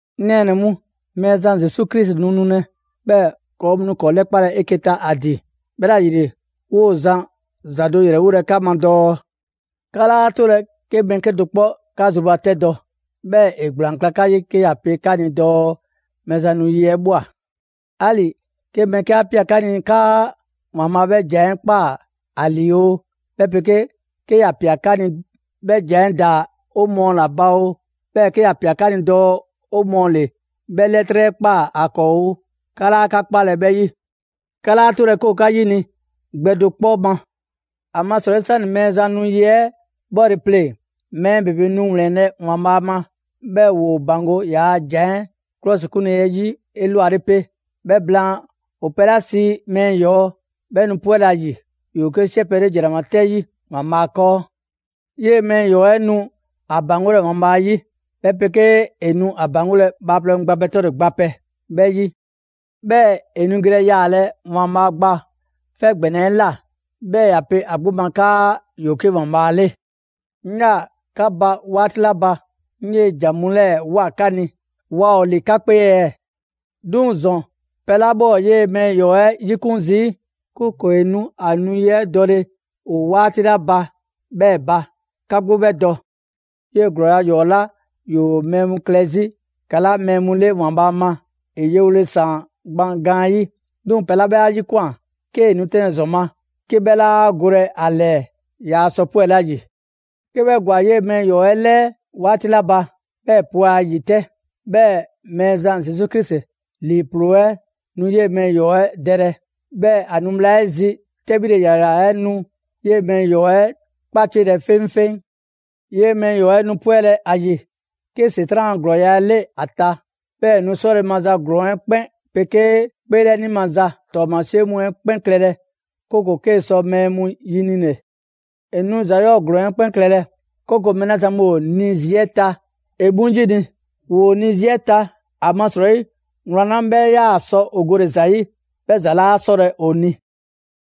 'Ŋ nɛɛnɛ‑ mu, Mɛɛzan Zesu Krisi nu nulɛ. 'Bhɛɛ‑ ‑kɔɔ' mu nu ‑kɔɔ' 'lɛkpalɛ 'eke‑ ta ‑a ‑din. 'Bhɛla‑ ‑yile, 'woo‑ zan ‑za do ‑yrɛwolɛ 'ka ma dɔɔ: 'Ka 'laa 'tolɛ‑ 'ke mɛɛ 'kedo‑ 'kpɔ 'ka zrubatɛdɔ, 'bhɛɛ‑ ‑e ‑gblaan kla 'ka 'yi, 'ke ‑ya pe 'ka ni dɔɔ Mɛɛzan nu yi 'ɛ ꞊bhwa. 'Ali‑ 'ke mɛɛ 'ke 'a ꞊pia 'ka ni 'kaa ‑Waanbhaa' 'bhɛ ‑jan 'ɛ ꞊kpaa ‑a ‑lii oo, 'bhɛ 'pegee 'ke ‑ya ꞊pia dɔɔ 'bhɛ ‑jan 'ɛ ‑daa 'o mɔɔ ‑la ba oo, 'bhɛɛ‑ 'ke ‑ya ꞊pia dɔɔ 'o mɔɔ ‑le 'bhɛ 'lɛtrɛ 'ɛ ꞊kpaa ‑a 'kɔɔ oo, 'ka 'laa 'ka 'kpalɛ‑ 'bhɛ 'yi. 'Ka 'laa 'tolɛ‑ 'ke ‑o 'ka 'yini‑ gbɛ do 'kpɔ ma. ‑Amasrɔyi 'sani‑ Mɛɛzan nu yi 'ɛ 'bhɔle‑ 'pleŋ‑, mɛɛ ‑bebe nu ‑wlɛnlɛ' ‑Waanbhaa' ma, 'bhɛɛ‑ ‑woo ‑baŋgo' ‑yaa' ‑jan 'ɛ 'klɔsikunle 'ɛ 'yi 'elwale 'pe. 'Bhɛ blaan, ‑o pɛ 'la sii ‹Mɛɛ ‑Yɔɔ'› 'bhɛ nu 'pwɛlɛ‑ ‑a ‑yi. ‑Yoo 'ke 'siɛ pɛ 'le ‑jranama 'tɛ 'yi ‑Waanbhaa' 'kɔɔ. 'Yee‑ Mɛɛ ‑yɔɔ 'ɛ nu ‑a ‑baŋgolɛ ‑Waanbhaa' 'yi, 'bhɛ 'pegee ‑e nu ‑a ‑baŋgolɛ bhaaplɛŋ mu gba pɛ 'tɔle‑ gba pɛ 'bhɛ 'yi. 'Bhɛɛ‑ ‑e nu gelɛ yaalɛ ‑Waanbhaa' Gba 'Fɛ ‑gbɛnɛ 'ɛ ꞊la, 'bhɛɛ‑ ‑ya pe ‑a 'gbu ma 'kaa ‑yoo 'ke ‑Waanbhaa' 'le. 'Ŋ 'yaa‑ 'ka ba 'waati 'la ba, 'ŋ 'yee‑ ‑jan mu 'lɛɛ‑ ꞊woa 'ka ni, waa ‑o ‑li 'ka 'kpee ɛɛ? 'Duŋ‑ ‑zɔn pɛ 'la 'bhɛ ‑o 'yee‑ Mɛɛ ‑yɔɔ' 'ɛ 'yikun zii', 'kooko‑ ‑e nu ‑a nu 'yi 'ɛ dɔle ‑o 'waati 'la ba 'bhɛɛ‑ ba, 'ka 'gbu 'bhɛ dɔ. 'Yee‑ ‑glɔɔya' ‑yɔɔ' 'la ‑yoo mɛɛ mu klɛ 'zi ‑kala' mɛɛ mu 'le ‑Waanbhaa' ma, ‑e yewole ꞊saan gban gaanyi'. 'Duŋ‑ pɛ 'la 'bhɛ 'a 'yikwan꞊ 'kee‑ nu 'tɛnlɛ‑ ‑zɔn ma, 'ke 'bhɛ 'laa golɛ ‑a ‑lɛɛ, yaa sɔ 'pwɛle ‑a ‑yi. 'Ke 'bhɛ ‑gwa 'yee‑ Mɛɛ ‑Yɔɔ' 'ɛ ‑lɛɛ 'waati 'la ba, 'bhɛɛ‑ ‑e 'pwɛ a ‑yi 'tɛ. 'Bhɛɛ‑ Mɛɛzan Zesu Krisi ‑lii ‑ploo 'ɛ nu 'yee‑ Mɛɛ ‑yɔɔ 'ɛ dɛlɛ. 'Bhɛɛ‑ ‑a nu bhla 'ɛ zi 'tɛbhile ‑yrayra 'ɛ nu 'yee‑ Mɛɛ ‑yɔɔ' 'ɛ 'kpaciɛlɛ 'feŋfeŋ. 'Yee‑ Mɛɛ ‑yɔɔ' 'ɛ nu 'pwɛlɛ‑ ‑a ‑yi 'ke ‑Setran' a ‑glɔɔya' 'ɛ 'le ‑a ta. 'Bhɛɛ‑ ‑e nu 'sɔle‑ maza ‑glɔɔn 'ɛ 'kpɛn 'pegee 'kpeelɛni maza ‑tɔɔmasie mu 'ɛ 'kpɛn klɛlɛ, 'kooko‑ 'kee‑ sɔ mɛɛ mu ‑yinile. ‑E nu ‑za 'yɔɔ‑ ‑glɔɔn 'ɛ 'kpɛn klɛlɛ, 'kooko‑ mɛɛ 'la zan mu ‑o ni 'zi 'ɛ ta, ‑e 'mu 'yini‑. ‑Woo 'ni 'zi 'ɛ ta, ‑amasrɔyi wlan 'la 'bhɛ 'yaa‑ sɔ ‑o gole‑ ‑za 'yi, 'bhɛ ‑za 'laa 'sɔlɛ‑ ‑o ni.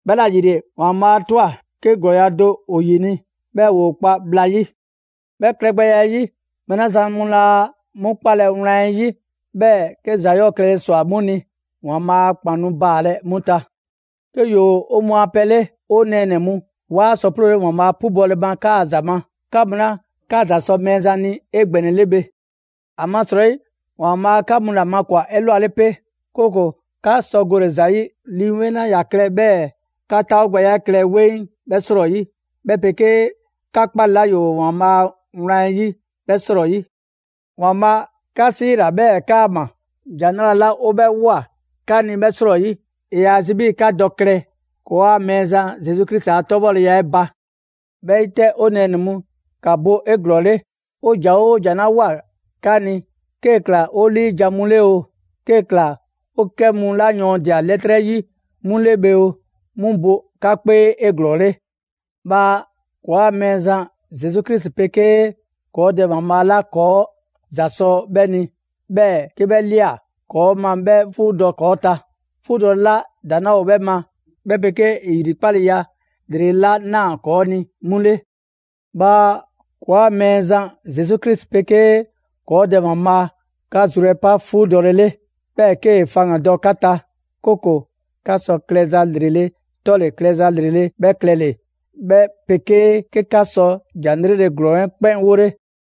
'Bhɛla‑ ‑yile, ‑Waanbhaa' 'a ꞊twa 'ke ‑glɔɔya' ‑do ‑o ‑yini', 'bhɛɛ‑ ‑woo kpa bhla 'yi. 'Bhɛ klɛgbɛya 'ɛ 'yi, mɛɛ 'la zan mu laa 'mu 'kpalɛ‑ wlan 'ɛ 'yi, 'bhɛɛ‑ 'ke ‑za 'yɔɔ‑ klɛle ꞊swa 'mu ni, ‑Waanbhaa' a ‑kpan nu baalɛ 'mu ta. 'Ke ‑yoo 'o mɔɔ a pɛ 'le, 'o nɛɛnɛ‑ mu, 'waa sɔ 'ploole ‑Waanbhaa' 'pubɔle 'kaa‑ ‑za ma, 'ka mu 'la 'ka ‑za sɔ Mɛɛzan ni 'egbɛnɛle bhe. ‑Amasrɔyi ‑Waanbhaa' 'ka mu ‑la makwan‑ 'elwale 'pe, 'kooko‑ 'ka sɔ gole‑ ‑za 'yi Lii 'Weŋ 'la ‑ya klɛ 'bhɛɛ‑ 'ka 'taawogbɛya 'ɛ klɛ 'weŋ 'bhɛ 'srɔyi, 'bhɛ 'pegee 'ka 'kpale 'la ‑yoo ‑Waanbhaa' a Wlan 'ɛ 'yi 'bhɛ 'srɔyi. ‑Waanbhaa' 'ka 'siila‑ 'bhɛɛ‑ 'kaama‑, ‑Jan 'Nrale‑ 'la 'o 'bhɛ ꞊woa 'ka ni 'bhɛ 'srɔyi. ‑E ‑yaa zi 'bhii‑ 'ka dɔ klɛ ‑kɔɔa' Mɛɛzan Zesu Krisi a 'tɔbhɔleya 'ɛ ba. 'Bhɛ 'yi 'tɛ, 'o nɛɛnɛ‑ mu, ‑ka bo 'eglɔɔle. 'O ‑jan 'oo ‑jan 'la ꞊woa 'ka ni, 'kee‑ ꞊kla 'o 'liijan‑ mu 'le oo, 'kee‑ ꞊kla 'o 'kɛ mu 'la yɔɔndia‑ 'lɛtrɛ 'yi 'mu 'le bhe oo, 'mu bo 'ka 'kpee 'eglɔɔle. Bhaa ‑kɔɔa' Mɛɛzan Zesu Krisi 'pegee ‑kɔɔ' Dɛ ‑Waanbhaa' 'la ‑kɔɔ' ‑za ꞊swa 'bhɛ ni, 'bhɛɛ‑ 'bhɛ ꞊lia ‑kɔɔ' ma 'bhɛ 'fuudɔ‑ ‑kɔɔ' ta, 'fuudɔle 'la ‑daŋ' 'laa 'bhɛ ma, 'bhɛ 'pegee ‑e ‑yrikpaleya ‑lrele' 'la ꞊naa ‑kɔɔ' ni 'mu 'le. Bhaa ‑kɔɔa' Mɛɛzan Zesu Krisi 'pegee ‑kɔɔ' Dɛ ‑Waanbhaa' 'ka zru 'ɛ pa 'fuudɔle 'le, 'bhɛɛ‑ 'kee‑ faŋgandɔ 'ka ta, 'kooko‑ 'ka sɔ klɛza ‑lrele' 'tɔle‑ klɛza 'lrele‑ 'bhɛ klɛle‑, 'bhɛ 'pegee 'ke 'ka sɔ ‑jan 'lrele‑ ‑glɔɔn 'ɛ 'kpɛn 'wole.